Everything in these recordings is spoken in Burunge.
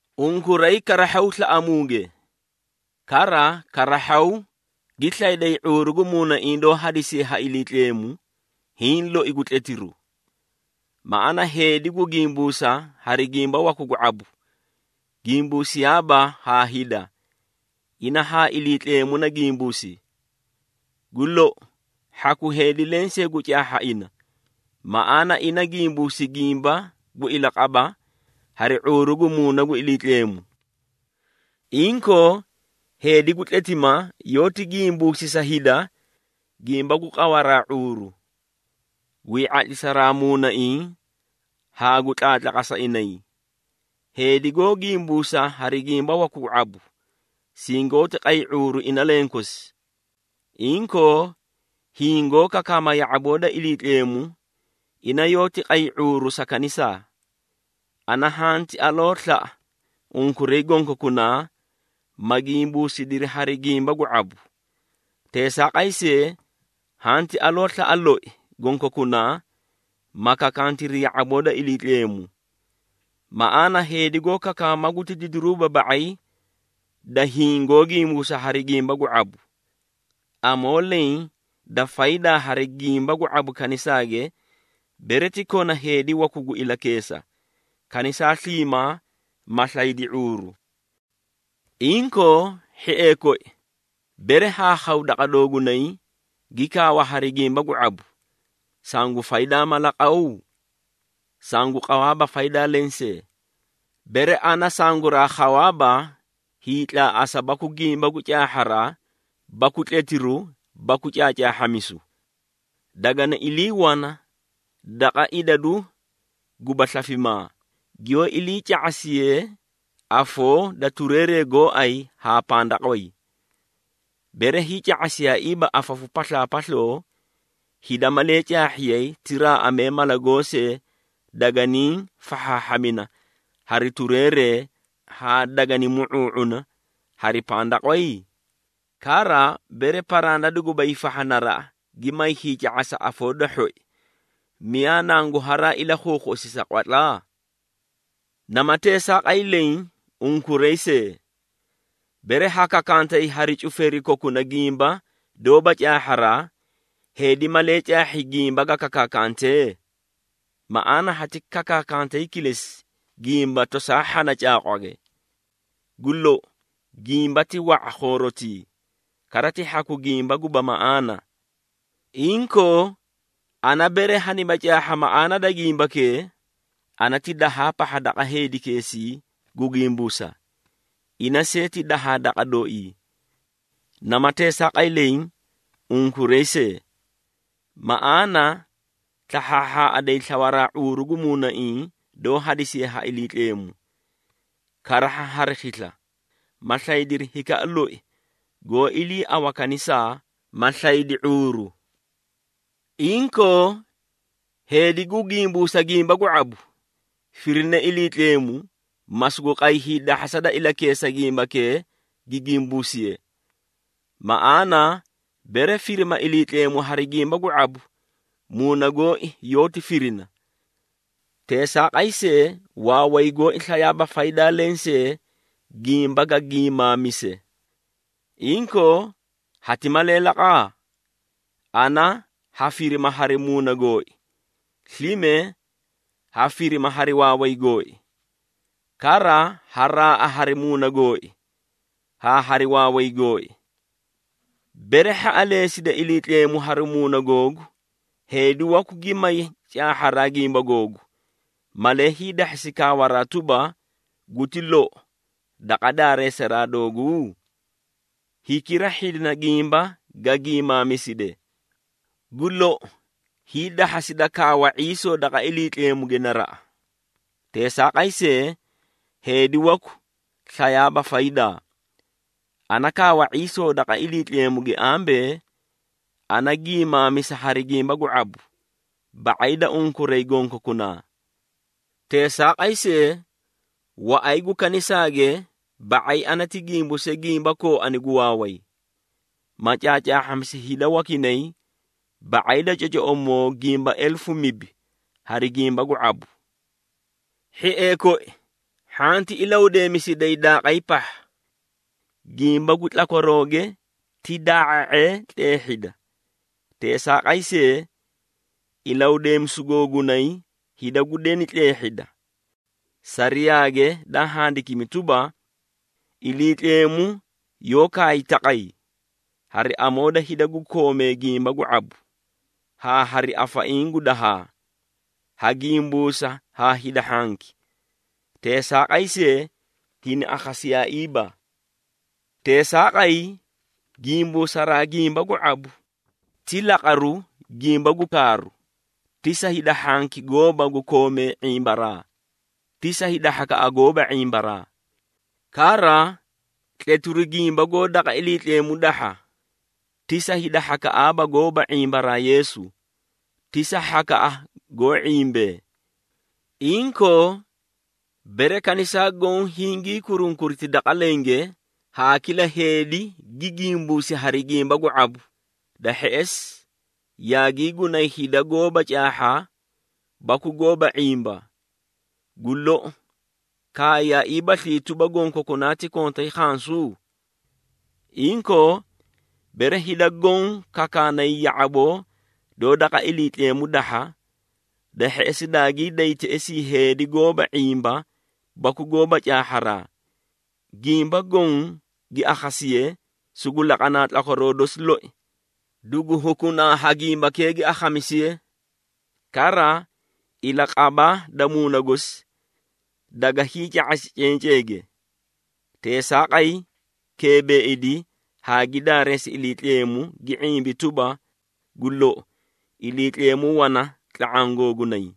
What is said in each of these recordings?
Unkuray karahhaw slaꞌamuuge. Kara karahhaw gi slayday ⁄uuru gu muunaiĩ doó hadisiye ha Iliitleemu, hiĩ loi gu tletiru. Maꞌaana heedi gu gimbuusa hari gimba waku gu ⁄abu, gimbuusiyaaba haa hida, ina haa Iliitleemu na gimbuusi. Gu lou, hhaku heedi lensee gu caahha ina, maꞌaana ina gimbuusi gimba gu ilaqaba hari ⁄uuru gu Muuna gu Iliitleemu. Inkoo, heedi gu tletima, yoóti gimbuusi sa hida gimba gu qawaraa ⁄uuru, gwii ⁄atlisaraa muunaiĩ haa gu tlaatlaqasa inay. Heedi goó gimbuusa hari gimba waku gu ⁄abu, singoóti qay ⁄uuru ina lenkosi. Inkoo, hiĩ goó kakaama ya⁄aboo da Iliitleemu, ina yoóti qay ⁄uuru sa kanisaa. Ana hanti aloo slaꞌa unkuray gonkokunaa, ma gimbuusidiri hari gimba gu ⁄abu. Teesaaqay see, hanti aloo slaꞌa loi gonkokunaa, ma kakantiri ya⁄aboo da Iliitleemu. Maꞌaana heedi goó kakaama guti didiru ba⁄ay da hiĩ goó gimbuusa hari gimba gu ⁄abu. Amoo leẽ da faydaa hari gimba gu ⁄abu kanisaage, bere ti kona heedi waku gu ilakeesa, kanisaa sliimaa ma slaydi ⁄uuru. Inkoo, hhiee koi, bere haa khaw daqa doogunay, gi kaawa hari gimba gu ⁄abu, sangu faydaa mala qaw? Sangu qawaaba faydaa lensee, bere ana sanguraa khawaaba hiitlaaꞌasa baku gimba gu caahharaa baku tletiru baku caacaahhamisu. Dagani ilii wana daqa idadu guba slafimaa, giyoó ilii ca⁄asiyee afoo da tureeree gooay haa pandaqway. Bere hiica⁄asiyaaiiba afafu paslaapasloo, hida malee caahhiyay ti raaꞌamee mala goosee daganii fahhaahhamina hari tureeree haa dagani mu⁄uu⁄una hari pandaqway? Kara, bere paranda duguba hiifahha naraꞌa, gi may hiica⁄asa afoo da hhoi, miyaa nangu haraa ilakhuukhuꞌusi sa qwatla? Nama teesaaqay leẽ, unkuray see. Bere ha kakaakantay hari cufeeri kokuna gimba doóba caahharaa, heedi malee caahhi gimba ga kakaakantee? Maꞌaana hati kakaantay kilesi gimba tosaa hhana caaqwage. Gu lou, gimba ti wa⁄a khoorotii, kara ti hhaku gimba guba maꞌaana. Inkoo, ana bere haniba caahha maꞌaana da gimbakee, ana ti dahaa daqa heedikeesii gu gimbuusa, ina see ti dahaa daqa dooii. Nama teesaaqay leẽ, unkuray see. Maꞌaana slahhaahhaꞌaday slawaraa ⁄uuru gu muunaiĩ doó hadisiye ha Iliitleemu, karahha hari khisla, ma slaydiri hikaꞌa loi goó iliiawa kanisaa, ma slaydi ⁄uuru. Inkoo, heedi gu gimbuusa gimba gu ⁄abu, firine Iliitleemu, ma sugu qay hiidahhasa da ilakeesa gimbakee gi gimbuusiye. Maꞌaana, bere firima Iliitleemu hari gimba gu ⁄abu, muuna gooi yoóti firina. Teesaaqay see, waaway gooi slayaaba faydaa lensee gimba ga gimaamise. Inkoo, hati malee laqa? Ana ha firima hari muuna gooi, slime ha firima hari waaway gooi. Kara ha raaꞌa hari muuna gooi haa hari waaway gooi. Bere hhaꞌaleesida Iliitleemu hari muuna googu, heedi waku gi may caahharaa gimba googu, malee hiidahhasi kaawaraa tuba, “Guti lou” daqa daareesaraa dooguu? Hikira hhidina gimba ga gimaamiside. Gu lou, hiidahhasida kaawa ⁄iisoo daqa Iliitleemuge naraꞌa. Teesaaqay see, heedi waku slayaaba faydaa. Ana kaawa ⁄iisoo daqa Iliitleemuge ambee, ana gimaamisa hari gimba gu ⁄abu ba⁄ay da unkuray gonkokunaa. Teesaaqay see, waꞌay gu kanisaage ba⁄ay ana ti gimbuuse gimba kooani gu waaway, ma caacaahhamisi hida wakinay ba⁄ay da cocoꞌomoo gimba elefu mibi hari gimba gu ⁄abu. Hhiee koi, hhanti ilahudeemisiday daaqay pahha. Gimba gu tlakwarooge ti daa⁄a⁄ee tleehhida. Teesaaqay see, ilahudeemisu googunay, hida gu deni tleehhida. Sariyaage daa handikimi tuba, “Iliitleemu yoó kaay taqay, ‘Hari amoo da hida gu koomee gimba gu ⁄abu, haa hari afaiĩ gu dahaa, ha gimbuusa haa hida hhanki, teesaaqay see, hini akhasiyaaiiba.’” Teesaaqay, gimbuusaraa gimba gu ⁄abu, ti laqaru gimba gu kaaru, ti sa hida hhanki gooba gu koomee ⁄imbaraa, ti sa hhakaꞌa goóba ⁄imbaraa. Kara, tletiru gimba goó daqa Iliitleemu dahha, ti sa hida hhakaꞌaaba goóba ⁄imbaraa Yeesu, ti sa hhakaꞌa goó ⁄imbee. Inkoo, bere kanisaa goõ hingii kurunkuriti daqa lenge, haa kila heedi gi gimbuusi hari gimba gu ⁄abu, da hheꞌesi yaagii gunay hida goóba caahha baku goóba ⁄imba, gu lou, kaayaaiibaslii tuba, gonkokunaa ti kontay khansu? Inkoo, bere hida goõ kakaanay ya⁄aboo doó daqa Iliitleemu dahha, da hheꞌesi daagii day teꞌesii heedi goóba ⁄imba baku goóba caahharaa, gimba goõ gi akhasiye sugu laqanaa tlakwaroo dosi loi, dugu hukunaa ha gimbakee gi akhamisiye. Kara, ilaqaba da muuna gosi daga hiica⁄asi cenceege. Teesaaqay, keebeeidi haa gi daareesi Iliitleemu gi ⁄imbi tuba, “Gu lou, Iliitleemu wana tla⁄aã googunay!”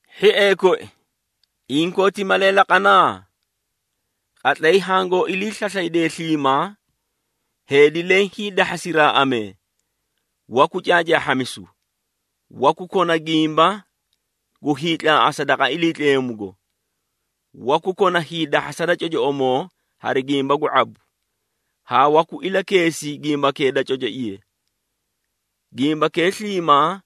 Hhiee koi, inkoo ti malee laqana? Qatlay hangoó ilii slaslaydee sliimaa, heedi leẽ hiidahhasi raaꞌamee, waku caacaahhamisu, waku kona gimba gu hiitlaaꞌasa daqa Iliitleemugo, waku kona hiidahhasa da cocoꞌomoo hari gimba gu ⁄abu, haa waku ilakeesi gimbakee da cocoiye. Gimbakee sliimaa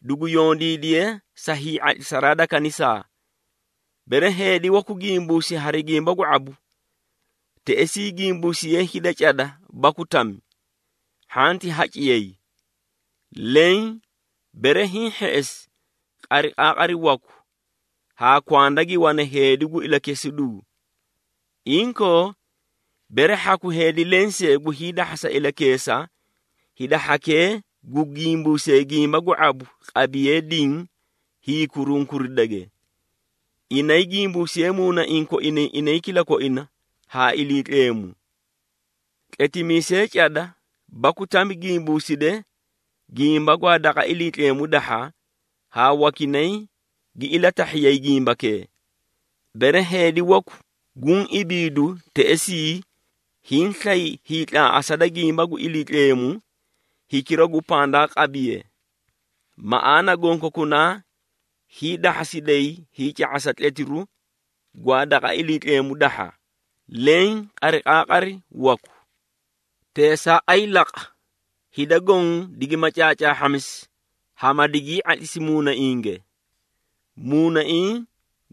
dugu yondiidiye sa hii⁄atlisaraa da kanisaa. Bere heedi waku gimbuusi hari gimba gu ⁄abu, teꞌesii gimbuusiyee hida cada baku tami, hhanti haciyay. Leẽ bere hiĩ hheꞌesi, qariqaaqari waku, haa kwanda gi wane heedi gu ilakesiduu. Inkoo, bere hhaku heedi lensee gu hiidahhasa ilakeesa, hida hhakee gu gimbuusee gimba gu ⁄abu qabiyee diĩ hiikurunkuridage. Inay gimbuusiyee muunaiĩ koinay inay kilakoina haa Iliitleemu. Tletimiisee cada baku tami gimbuuside gimba gwaa daqa Iliitleemu dahha haa wakinay gi ilatahhiyay gimbakee. Bere heedi waku guũ ibiidu teꞌesii hiĩ slay hiitlaaꞌasa da gimba gu Iliitleemu, hikira gu pandaa qabiye. Maꞌaana gonkokunaa hiidahhasiday hiica⁄asa tletiru gwaa daqa Iliitleemu dahha, leẽ qariqaaqari waku. Teesaaqay laqa, hida goõ digima caacaahhamisi haa ma digii ⁄atlisi muunainge. Muunaiĩ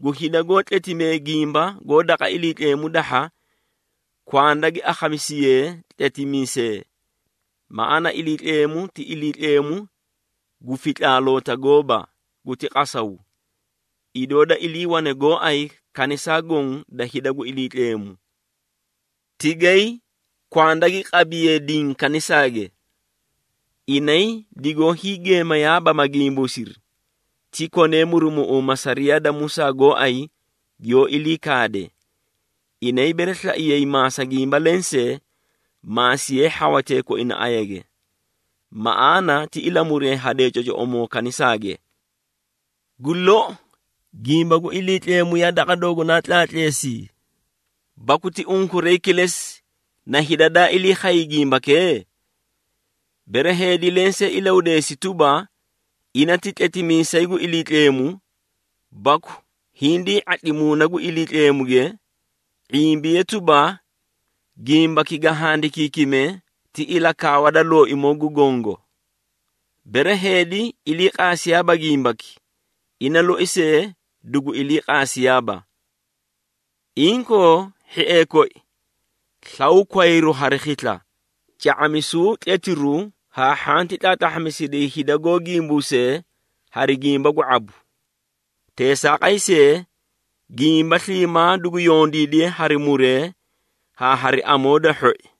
gu hida goó tletimee gimba goó daqa Iliitleemu dahha kwanda gi akhamisiyee tletimiisee. Maꞌaana Iliitleemu, ti Iliitleemu gu fitlaaloota gooba, guti qasaw, idoo da iliiwane gooay kanisaa goõ da hida gu Iliitleemu. Tigay kwanda gi qabiyee diĩ kanisaage. Inay digoó hiigeemeyaaba ma gimbuusiri, ti konee murumuꞌuuma sariyaa da Musaa gooay giyoó ilii kaade. Inay bere slaiyay maasa gimba lensee, maasiyee hhawatee koina ayage. Maꞌaana ti ilamuree hadee cocoꞌomoo kanisaage. Gu lou, gimba gu Iliitleemu yaa daqa doogunaa tlaatleesii? Baku ti unkuray kilesi na hida daa ilii khay gimbakee? Bere heedi lensee ilahudeesi tuba, ina ti tletimiisay gu Iliitleemu, baku hindii ⁄atli Muuna gu Iliitleemuge, ⁄imbiye tuba, gimbaki ga handikiikime ti ilakaawa da Looimoo gu Gongo. Bere heedi iliiqaasiyaaba gimbaki, ina loi see dugu iliiqaasiyaaba. Inkoo, hhiee koi, slaw kwayru hari khisla ca⁄amisuu tletiru haa hhanti tlaatlahhasiday hida goó gimbuusee hari gimba gu ⁄abu. Teesaaqay see, gimba sliimaa dugu yondiidiye hari muree haa hari amoo da hhoi.